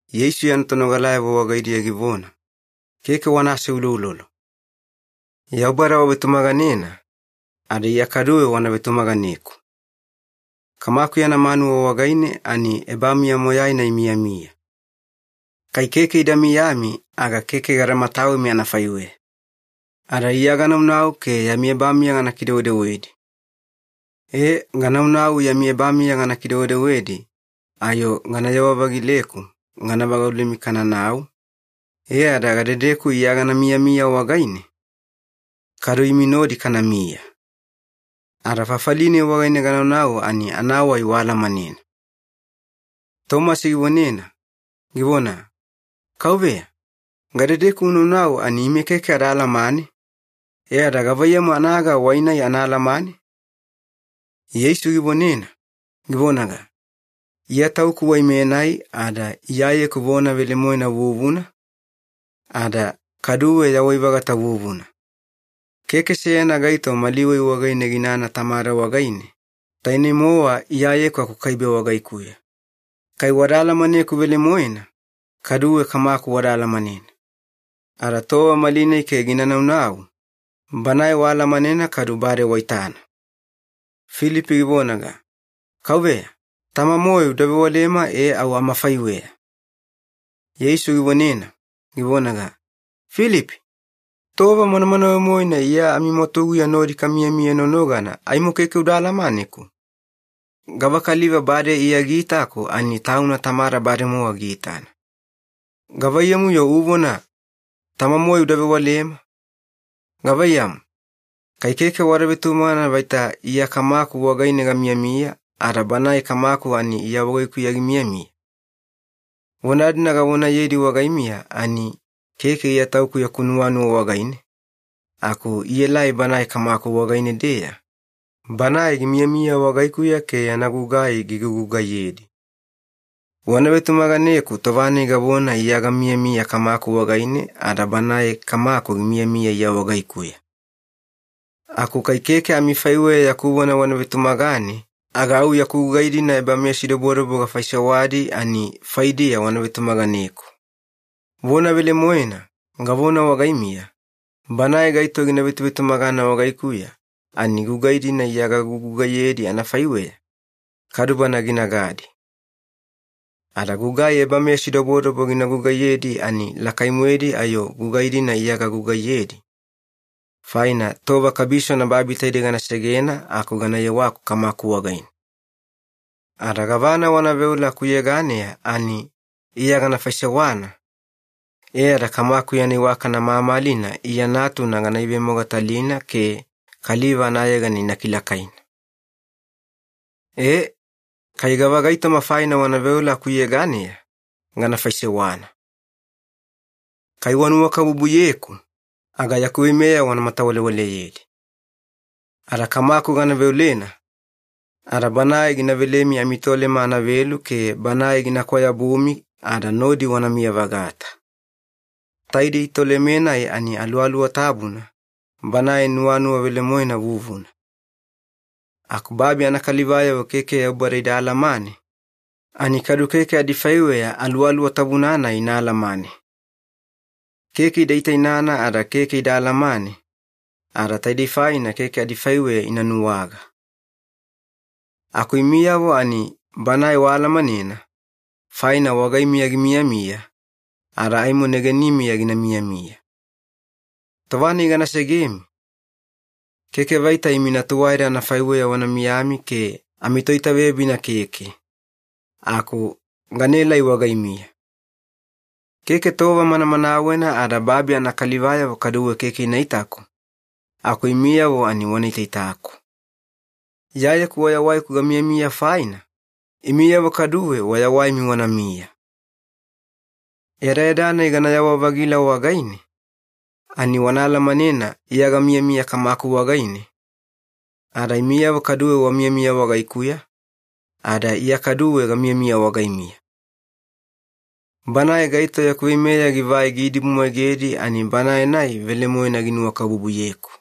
Yeisu yana tonogalayavo wagaidiya givona, “Keke wana aseuloulolo. Yaubada wavetumaganena, ada Iya kaduwe wana vetumaganeku. Kamaku yana manuwa wagaine ani ebamiya moyaina imiyamiya. Kai keke ida miyami aga keke gada matawemi anafaiweya. Ada Iya ganaunau ke yami ebamiya gana kidewedewedi. E, gananau yami ebamiya gana kidewedewedi ayo ganayewa-vagileku gana vagaulemi kananau, e ada gadedeku Iya gana miyamiya wagaine, kadu imi nodi kanamiya. Ada fafali-nai wagaine ganaunau ani anawai waalamanena.” Tomasi givonena, givona, “Kauveya, gadedeku unaunau ani ime keke ada alamane, e ada gavaiyamu anaga wai-nai ana alamane?” Yeisu givonena, givonaga, “Iya Tauku wai-menai ada Iyayeku vona velemoena vuvuna, ada kaduwe yawai-vagata vuvuna. Keke seyana gaito mali wai wagaine ginana Tamada wagaine, taine-mowa Iyayeku akukaibe wagaikuya. Kai wada alamaneku velemoena, kaduwe Kamaku wada alamanena. Ada tova malinai ke gina naunau, Banae waalamanena kadu bade waitana.” Filipi givonaga, “Kauveya, Tama-moe uda vewalema e au amafaiweya.” Yeisu givonena, givonaga, “Filipi, tova manamanawe-moena Iya amimwatuguya nodi kamiyamiya nonogana aimo keke uda alamaneku? Gavakaliva bade Iya giitaku ani tauna Tamada bademowa giitana. Gavaiyamu-yo uvona, ‘Tama-moe uda vewalema’? Gavaiyamu, kai keke wada vetumagana vaita Iya Kamaku wagaine gamiyamiya, ada Banae Kamaku ani Iya wagaikuya gimiyamiya? Vona-dina gavonayedi wagaimiya, ani keke Iya Tauku yaku nuwanuwa wagaine, aku ielai Banae Kamaku wagaine-deya, Banae gimiyamiya wagaikuya ke yana gugai gigugugaiyedi. Wana vetumaganeku tova-nai gavona Iya gamiyamiya Kamaku wagaine ada Banae Kamaku gimiyamiya Iya wagaikuya. Aku kai keke amifaiweya yaku vona wana vetumagane aga au yaku gugai-dina ebameyasidobodobo gafaisewadi ani faidiya wana vetumaganeku. Vona velemoena, gavona wagaimiya, banae gaito gina vetuvetumagana wagaikuya ani gugai-dina Iya gagugugaiyedi anafaiweya, kadu bana ginagadi. Ada gugai ebameyasidobodobo gina gugaiyedi ani lakai-moedi ayo gugai-dina Iya gagugaiyedi, faina tova kabisona babi taidei gana segena aku gana yewaku Kamaku wagaine. Ada gavana wana veola akuyeganeya ani Iya gana faisewana, e ada Kamaku yana iwakana mamalina Iya Natuna gana ivemogatalina ke kaliva anayegana ina kilakaina. E, kai gavagaitoma faina wana veola akuyeganeya, gana faisewana. “Kai wanuwakabubuyeku, aga yaku veimeya wana matawalewaleyedi. Ada Kamaku gana veolena, ada Banae gina velemi amiTolema anavelu ke Banae gina kwayabumi ada nodi wanamiya-vagata. Taidei Toleme-nai ani Aluwaluwa Tabuna, Banae nuwanuwa velemoena vuvuna. Aku babi anakalivayavo keke Yaubada ida alamane, ani kadu keke adifaiweya Aluwaluwa Tabuna-nai ina alamane. Keke ida itainana ada keke ida alamane, ada taidei faina keke adifaiweya ina nuwaga. Aku imiyavo ani Banae waalamanena, faina wagaimiya gimiyamiya, ada aimo negenimiya gina miyamiya. Tova-nai gana segemi, keke vaita imi natuwaeda anafaiweya wana miyami ke amitoitaveyabina keke, aku ganaelai wagaimiya. Keke tova manamanawena ada babi anakalivayavo kaduwe keke ina itaku, aku imiyavo ani wana itaitaku. Iyayeku wayawaiku gamiyamiya faina, imiyavo kaduwe wayawaimi wanamiya. Yadayada-nai ganayawa-vagila wagaine, ani wana alamanena Iya gamiyamiya Kamaku wagaine, ada imiyavo kaduwe wamiyamiya wagaikuya, ada Iya kaduwe gamiyamiya wagaimiya. Banae gaito yaku veimeya givai giidibumwaigedi ani banae-nai velemoena ginuwakabubuyeku.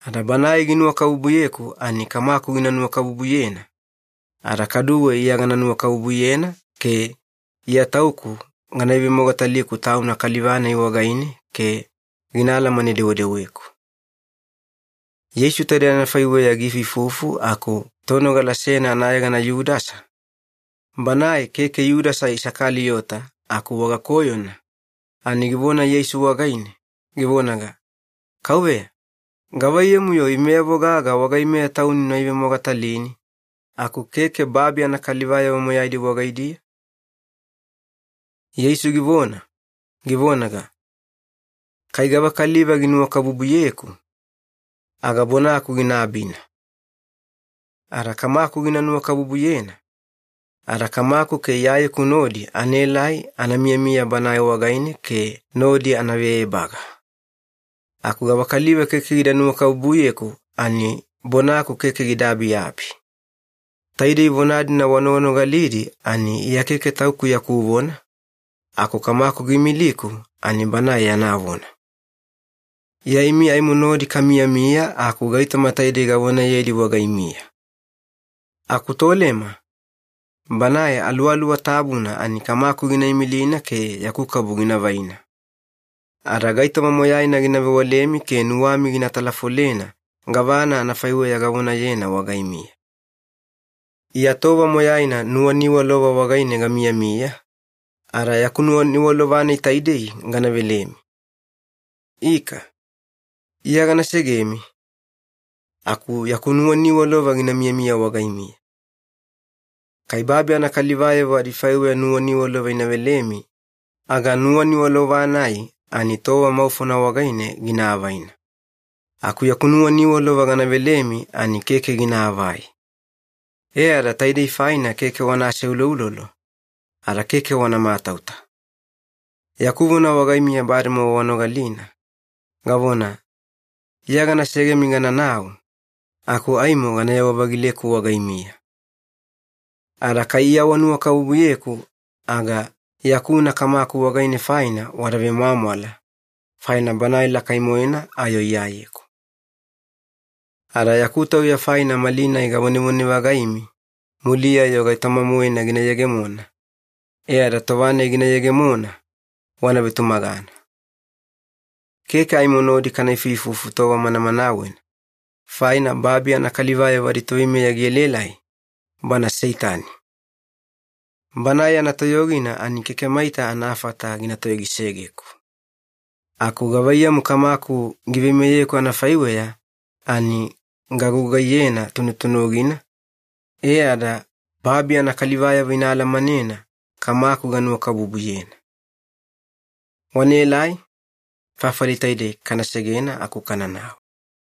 Ada banae ginuwakabubuyeku ani Kamaku gina nuwakabubuyena, ada kaduwe Iya gana nuwakabubuyena ke Iya Tauku gana ivemogataliku tauna kaliva-nai wagaine ke gina alamane-dewedeweku.” Yeisu taidei anafaiweya giifuifufu aku tonogala seyana anayegana Yudasa, banae keke Yudasa Isakaliyota aku wagakoyona, ani givona Yeisu wagaine, givonaga, “Kauveya, gavaiyamu-yo imeyavo gaga wagaimeya Tauni una ivemogatalini aku keke babi anakalivayavo moyaidi wagaidiya?” Yeisu givona, givonaga, “Kai gavakaliva ginuwakabubuyeku, aga bonaku gina abina. Ada Kamaku gina nuwakabubuyena, ada Kamaku ke Iyayeku nodi anaelai ana miyamiya banae wagaine ke nodi anave ebaga. Aku gavakaliva keke gida nuwakabubuyeku ani bonaku keke gida abiabi. Taidei vona-dina wanoganogalidi ani Iya keke Tauku yaku vona, aku Kamaku giimiliku ani Banae yana vona. “Iya imi aimo nodi kamiyamiya aku gaitoma taidei gavonayedi wagaimiya. Aku Tolema, Banae Aluwaluwa Tabuna ani Kamaku gina imilina ke yaku kabu gina vaina. Ada gaitoma moyaina gina vewalemi ke nuwami gina talafolena gavana anafaiweya gavonayena wagaimiya. “Iya tova moyaina nuwaniwalova wagaine gamiyamiya, ada yaku nuwaniwalova-nai taidei gana velemi. Ika, Iya gana segemi, aku yaku nuwaniwalova gina miyamiya wagaimiya. Kai babi anakalivayavo adifaiweya nuwaniwalova ina velemi aga nuwaniwalova-nai ani tova maufona wagaine gina avaina. Aku yaku nuwaniwalova gana velemi ani keke ginaavai. E ada taidei faina keke wana aseuloulolo, ada keke wana matauta. Yaku vona wagaimiya bademowa wanogalina, gavona, ‘Iya gana segemi gananau, aku aimo ganayewa-vagileku wagaimiya.’ Ada kai Iya wanuwakabubuyeku aga yakuna Kamaku wagaine faina wada vemwamwala, faina Banae lakai-moena ayo Iyayeku. Ada yaku tauya faina malinai gavonevone-vagaimi muliya-yo gaitoma-moena gina yegemona, e ada tova-nai gina yegemona, wana vetumagana. “Keke aimo nodi kana ifuifufu tova manamanawena, faina babi anakalivayavo aditoveimeya gielaelai, bana Seitani. Banae yana toyogina ani keke maita anafata gina toyogisegeku, aku gavaiyamu Kamaku giveimeyeku anafaiweya ani gagugaiyena tunutunugina, e ada babi anakalivayavo ina alamanena Kamaku ganuwakabubuyena. Wanaelai, fafali taidei kana segena aku kananau.”